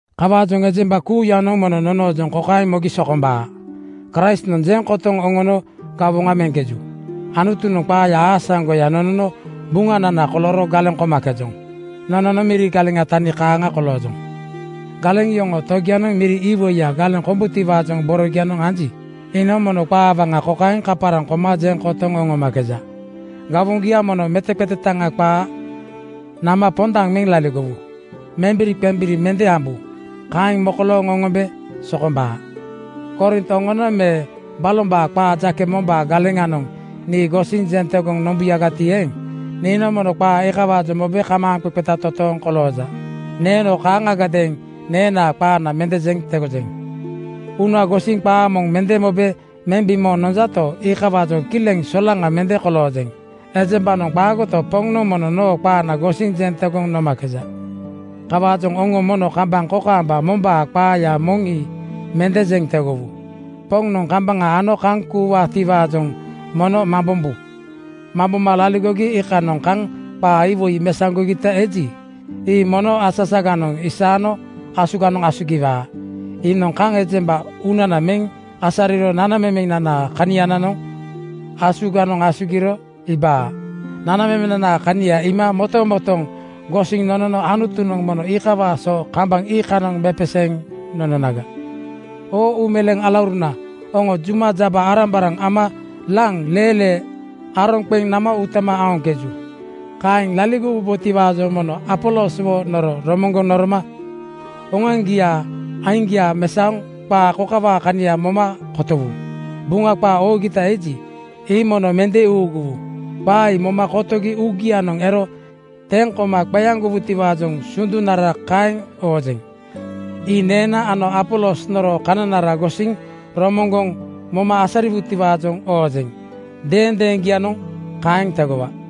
Kawaajoŋ ejemba kuuyanoŋ mono nonoojoŋ kokaeŋ mogi sokombaa: Kraistnoŋ jeŋ kotoŋ oŋono gawoŋa meŋkeju. Anutunoŋ qaaya aasaŋgoya nonono buŋanana kolooro galeŋ komakejoŋ. Nononoŋ miri galeŋaa tani kaaŋa koloojoŋ. Galeŋ yoŋoo togianoŋ miri iwoiya galeŋ kombutiwaajoŋ borogianoŋ anji, iinoŋ mono qaa waŋa kokaeŋ kaparaŋ koma jeŋ kotoŋ oŋomakeja, “Gawoŋgia mono meteqetetaŋa qaa nama pondaŋ meŋ laligowu. Membiriqembiri mende ambu. Kaeŋ mokolooŋ oŋombe sokombaa.” Korint oŋonoŋ me balombaa qaa jake mombaa galeŋanoŋ nii gosiŋ jeŋ tegoŋ nombuyagati eeŋ, niinoŋ mono qaa iikawaajoŋ mobe kamaaŋqeqeta totooŋ kolooja. Neeno kaaŋagadeeŋ neenaa qaana mende jeŋ tegojeŋ. Uuna gosiŋ qaa moŋ mende mobe meŋ bimooŋ nonjato, iikawaajoŋ kileŋ solaŋa mende koloojeŋ. Ejembanoŋ qaagoto, Poŋnoŋ mono noo qaana gosiŋ jeŋ tegoŋ nomakeja. Kawaajoŋ oŋo mono kambaŋ kokaamba mombaa qaaya moŋ ii mende jeŋ tegowu. Poŋnoŋ kambaŋa ano kaŋ kuuwaatiwaajoŋ mono mambombu. Mamboma laligogi iikanoŋ kaŋ qaa iwoi mesaŋgogita eji, ii mono asasaganoŋ isaano asuganoŋ asugiwaa. Iinoŋ kaŋ ejemba uunana meŋ asariro nanamemenanaa kanianoŋ asuganoŋ asugiro iibaa. Nanamemenanaa kania iima motomotooŋ gosiŋ nonono Anutunoŋ mono iikawaa so kambaŋ iikanoŋ mepeseeŋ nononaga. Oo uumeleeŋ alauruna, oŋo juma jaba-arambaraŋ ama laŋ leelee aroŋ qeŋ nama utama aoŋkeju. Kaeŋ laligowubotiwaajoŋ mono Apoloswo noro romoŋgoŋ noroma oŋoaŋgiaa aiŋgia mesaoŋ qaa kokawaa kania moma kotowu, “Buŋa qaa oogita eji, ii mono mende uuguwu.” Qaa ii moma kotogi uugianoŋ ero teŋ koma qeaŋgowutiwaajoŋ sundunara kaeŋ oojeŋ. Ii neena ano Apolos noroo kananara gosiŋ romoŋgoŋ moma asariwutiwaajoŋ oojeŋ. Deendeeŋgianoŋ kaeŋ tegowaa.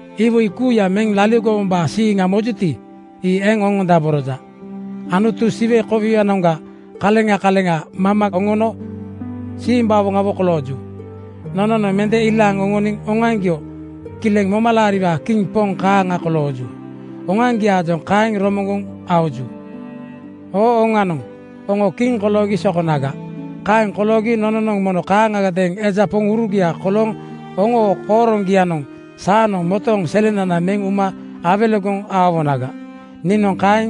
Iwoi kuuya meŋ laligowombaa siiŋa mojuti, ii eŋ oŋondaboroja. Anutunoŋ Siwe kowianoŋga kaleŋa kaleŋa maama oŋono simbawoŋawo kolooju. Nononoŋ mende ilaaŋ oŋoniŋ oŋoaŋgio kileŋ momalaariwaa kiŋ poŋ kaaŋa kolooju. Oŋoaŋgiaajoŋ kaeŋ romoŋgoŋ aoju. Oo oŋanoŋ oŋo kiŋ koloogi sokonaga. Kaeŋ koloogi nononoŋ mono kaaŋagadeeŋ eja poŋurugia kolooŋ oŋoo kooroŋgianoŋ saanoŋ motooŋ selenana meŋ uma awelegoŋ aowonaga. Niinoŋ kaeŋ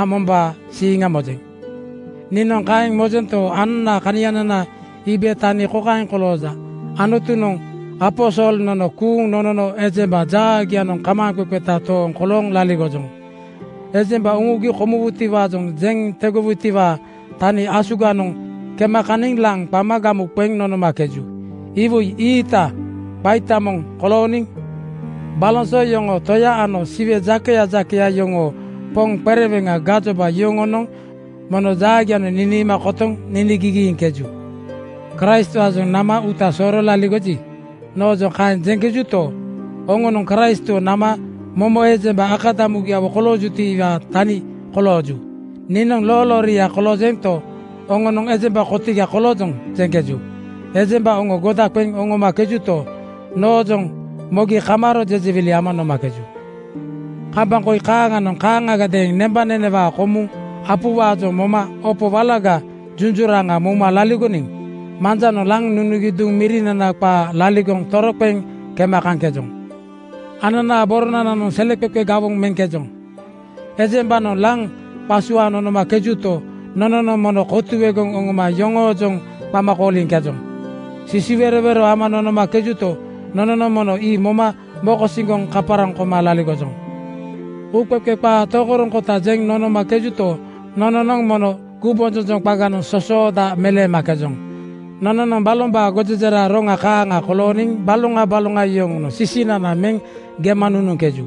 ambombaa siiŋa mojeŋ. Niinoŋ kaeŋ mojento, ananaa kanianana iibe tani kokaeŋ kolooja: Anutunoŋ aposol nono kuuŋ nonono ejemba jaagianoŋ kamaaŋqeqeta tooŋ kolooŋ laligojoŋ. Ejemba uŋugi komuwutiwaajoŋ jeŋ tegogitiwaa tania asuganoŋ kema kaniŋ laŋ qama gamu qeŋ nonomakeju. Iwoi ii-iita qaita moŋ kolooniŋ baloŋ so yoŋoo toya ano Siwe jakeya jakeya yoŋoo poŋ qereweŋa gajoba yoŋonoŋ mono jaagianoŋ niniima kotoŋ niniigigiiŋkeju. “Kraistwaajoŋ nama uuta sooro laligoji,” noojoŋ kaeŋ jeŋkejuto, oŋonoŋ Kraistwo nama momo ejemba akadamugiawo koloojutiwaa tani kolooju. Niinoŋ loolooria koloojento, oŋonoŋ “Ejemba kotiga koloojoŋ,” jeŋkeju. Ejembanoŋ oŋo goda qeŋ oŋomakejuto, noojoŋ mogi kamaaro jejewili ama nomakeju. Kambaŋ koi kaaŋanoŋ kaaŋagadeeŋ nembanenewaa komuŋ apuwaajoŋ moma opo walaga junjuraŋa mouma laligoniŋ manjanoŋ laŋ nunugi duŋ mirinana qaa laligoŋ toroqeŋ kema kaŋkejoŋ. Ananaa boronananoŋ seleqeqe gawoŋ meŋkejoŋ. Ejembanoŋ laŋ qasuaaŋ nonomakejuto, nononoŋ mono kotuegoŋ oŋoma yoŋoojoŋ qama kooliŋkejoŋ. Sisiwerowero ama nonomakejuto, nononoŋ mono ii moma mokosiŋgoŋ kaparaŋ koma laligojoŋ. Uuqeqe qaa tokoroŋkota jeŋ nonomakejuto, nononoŋ mono gumbonjonjoŋ qaganoŋ sosooda meleemakejoŋ. Nononoŋ balombaa gojejera roŋaa kaaŋa kolooniŋ baloŋa baloŋa yoŋonoŋ sisinana meŋ gema nunuŋkeju.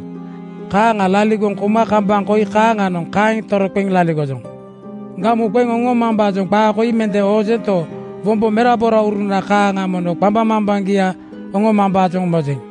Kaaŋa laligoŋ kouma kambaŋ koi kaaŋanoŋ kaeŋ toroqeŋ laligojoŋ. Gamu qeŋ oŋomambaajoŋ qaa koi mende oojento, wombo meraborauruna kaaŋa mono qambaŋmambaŋgia oŋomambaajoŋ mojeŋ.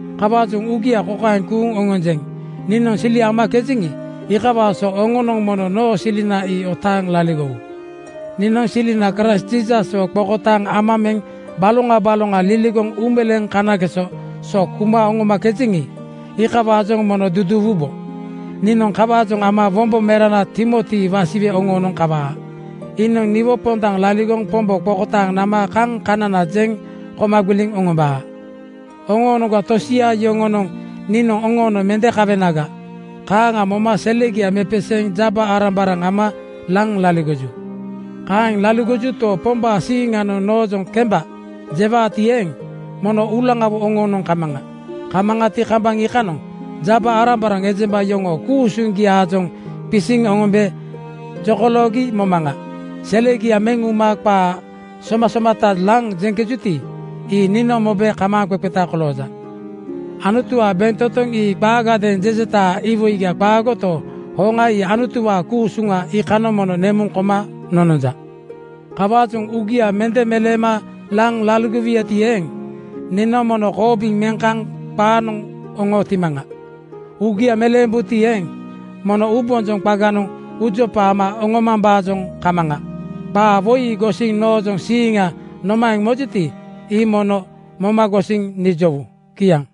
Kawaajoŋ uugia kokaeŋ kuuŋ oŋonjeŋ: Niinoŋ sili amakejeŋi, iikawaa so oŋonoŋ mono noo silina ii otaaŋ laligowu. Niinoŋ silina Kraist Jiisaswo qokotaaŋ ama meŋ baloŋa baloŋa liligoŋ uumeleeŋ kanageso so kuma oŋomakejeŋi, iikawaajoŋ mono duduuwubo. Niinoŋ kawaajoŋ ama wombo merana Timoti wasiwe oŋoonoŋ kawaa. Iinoŋ niwo pondaŋ laligoŋ Pombo qokotaaŋ nama kaŋ kanana jeŋ koma gbiliŋ oŋombaa. Oŋoonoŋga tosia yoŋonoŋ niinoŋ oŋoonoŋ mende kawenaga, kaaŋa moma selegia mepeseeŋ jaba-arambaraŋ ama laŋ laligoju. Kaeŋ laligojuto, Pombaa siiŋanoŋ noojoŋ “Kemba!” jewaati eeŋ, mono uulaŋawo oŋoonoŋ kamaŋa. Kamaŋati, kambaŋ iikanoŋ jaba-arambaraŋ ejemba yoŋoo ku-usuŋgiaajoŋ qisiŋ oŋombe jokoloogi momaŋa. Selegia meŋ uma qaa somasomata laŋ jeŋkejuti, ii niinoŋ mobe kamaaŋqeqeta kolooŋkeja. Anutuwaa bentotoŋ ii qaagadeeŋ jejetaa iwoiga qaagoto, hoŋa ii Anutuwaa ku-usuŋa. Iikanoŋ mono nemuŋ koma nononja. Kawaajoŋ uugia mende meleema laŋ laligowuyati eeŋ, niinoŋ mono koobiŋ meŋ kaŋ qaanoŋ oŋootimaŋa. Uugia meleembuti eeŋ, mono uubonjoŋ qaganoŋ uujopa ama oŋomambaajoŋ kamaŋa? Qaa woi ii gosiŋ noojoŋ siiŋgia nomaeŋ mojuti, ii mono moma gosiŋ nijowu. Kiaŋ.